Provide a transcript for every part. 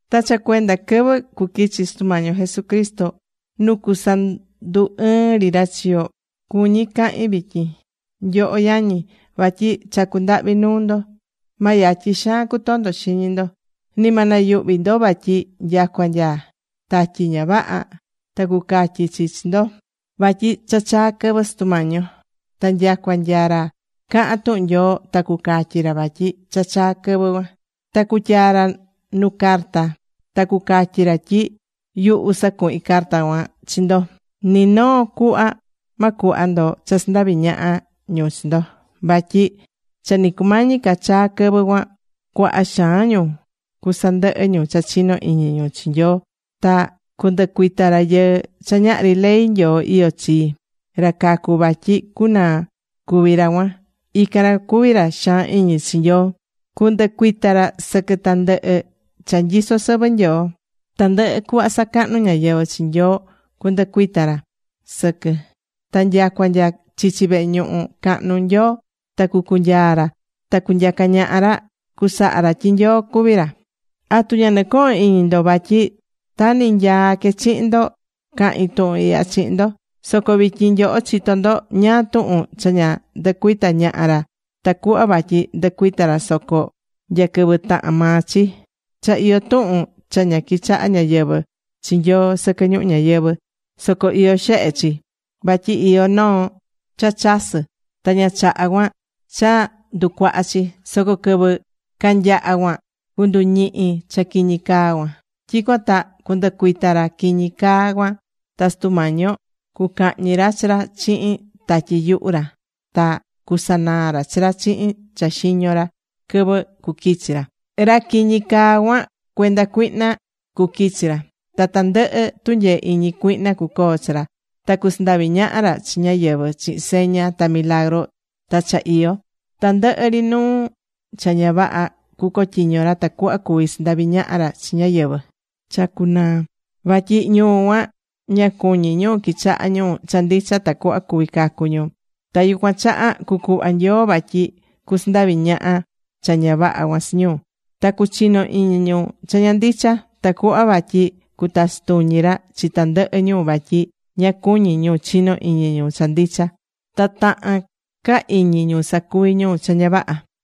Ta cha cuenda quɨvɨ cuquichi Sutu Mañi yo Jesucristo nu cusandu ɨɨn ri ra chi yo, cuñí cahin vityin, nyoho yañi. Vatyi chacú ndahvi nuu ndo, ma yatyi xaan cutondo xiñi ndo. Ni ma nayuhvi ndo vatyi nyacua nya tatyi ñavaha ta cucatyi chi chi ndo vatyi cha chaa̱ quɨvɨ Sutu Mañi yo, ta nyacua nya ra cahán tuhun Nyoo ta cucatyi ra vatyi cha chaa quɨvɨ cuan, ta cutyaa ra nu carta ta cucatyi ra tyi yuhu sacuhin carta cuan chi ndo. Ni noo cuhva ma cuhva ndo cha sandavi ñaha ñu chi ndo. Vatyi cha ni cumañi ca chaa quɨvɨ cuan cuaha xaan ñu cusandɨhɨ ñu cha chino iñi ñu chi Nyoo ta cundɨcuita rayɨɨ cha ñahri ley Nyoo iyó chi, ra cacu vatyi cunaa cuví ra cuan. Ican ra cuví ra xaan iñi chi Nyoo. Cundɨcuita ra sɨquɨ tandɨhɨ cha nyisó sɨvɨ Nyoo. Tandɨhɨ cuhva sacahnú ñáyɨvɨ chi Nyoo cunducuita ra sɨquɨ. Ta nyacua nya chichi vehe ñuhu cahnu Nyoo ta cucunyaa ra ta cunyaca ñaha ra, cusaha ra tyi Nyoo cuví ra. ¿Atu ña nɨcohón iñi ndo vatyi ta ni nyaa que chihin ndo cahin tuhun ihya chihin ndo? Soco vityin nyoho chitó ndo ñáá tuhun cha ña ndɨcuita ñaha ra tacuhva vatyi ndɨcuita ra soco nya quɨvɨ tahán maa chi. Cha iyó tuhun cha ña quichahá ñáyɨvɨ chi Nyoo sɨquɨ ñuhu ñayɨvɨ̱, soco iyó xehe chi, vatyi iyó noo cha chasɨ́, ta ña chahá cuan cha nducuaha chi. Soco quɨvɨ canyaha cuan, cunduñihi cha quiñi caa cuan. Tyicuan ta cundɨcuita ra quiñi caa cuan ta Sutu Mañi yo cucahñi ra chi ra chihin tatyi yuhu ra ta cusanaa ra chi ra chihin cha xiño ra quɨvɨ cuquichi ra. Ra quiñi caa cuan, cuenda cuihna cuquichi ra. Ta tandɨhɨ tunyee iñi cuihna cucoo chi ra, ta cusandavi ñaha ra chi ñáyɨvɨ chihin seña ta milagru ta cha iyo. Tandɨhɨ ri nuu cha ña vaha cucotyiño ra tacuhva cuvi sandavi ñaha ra chi ñáyɨvɨ cha cucunaa. Vatyi ñu cuan ña cuñí ñu quichaha ñu cha ndicha tacuhva cuvi cacu ñu. Ta yucuan chaha cucuhva Nyoo vatyi cusandavi ñaha cha ña vaha cuan chi ñu. Ta cuchino iñi ñu cha ña ndicha. Tacuhva vatyi cutachi tuñi ra chi tandɨhɨ ñu vatyi ña cuñí ñu chino iñi ñu cha ndicha. Ta tahán ca iñi ñu sacuví ñu cha ña vaha.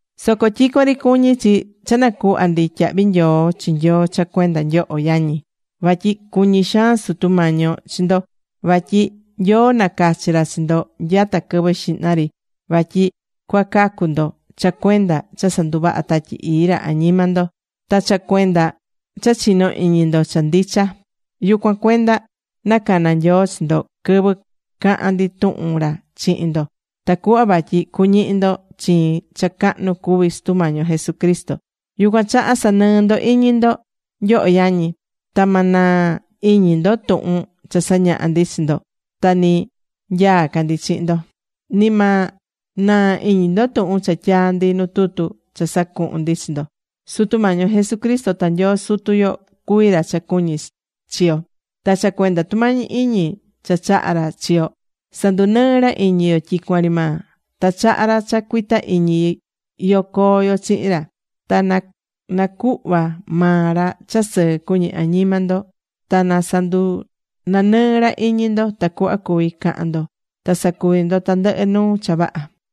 Soco tyicuan ri cuñí chi cha nacuhva ndi tyahvi nyoo chi Nyoo cha cuenda nyoho yañi. Vatyi cuñí xaan Sutu Mañi yo chi ndo. Vatyi Nyoo nacachi̱ ra chi ndo nyata quɨvɨ xihna ri vatyi cuacacu ndo cha cuenda cha sanduvaha Tatyi Ii ra añima ndo ta cha cuenda cha chinó iñi ndo cha ndicha. Yucuan cuenda nacana̱ Nyoo chi ndo quɨvɨ caha̱n ndi tuhun ra chihin ndo tacuhva vatyi cuñihi ndo chiin cha cahnu cuví Sutu Mañi yo Jesucristo. Yucuan chaha sa̱nɨɨ ndo iñi ndo, nyoho yañi. Ta ma naa iñi ndo tuhun cha sañaha̱ ndi chi ndo ta ni nyaa ca ndi chihin ndo. Ni ma naa iñi ndo tuhun cha tyaa̱ ndi nu tutu cha sacuhu̱n ndi chi ndo. Sutu Mañi yo Jesucristo ta Nyoo Sutu yo cuví ra cha cuñí chi yo. Ta cha cuenda tumañi iñi cha chahá ra chi yo sandunɨɨ́ ra iñi yo tyicuan ri maa. Ta chahá ra cha cuita iñi yo coo yo chihin ra. Ta na nacuhva maa ra cha sɨɨ cuñi añima ndo. Ta na sandunanɨɨ ra iñi ndo, tacuhva cuvi cahan ndo ta sacuvi ndo tandɨhɨ nuu cha vaha.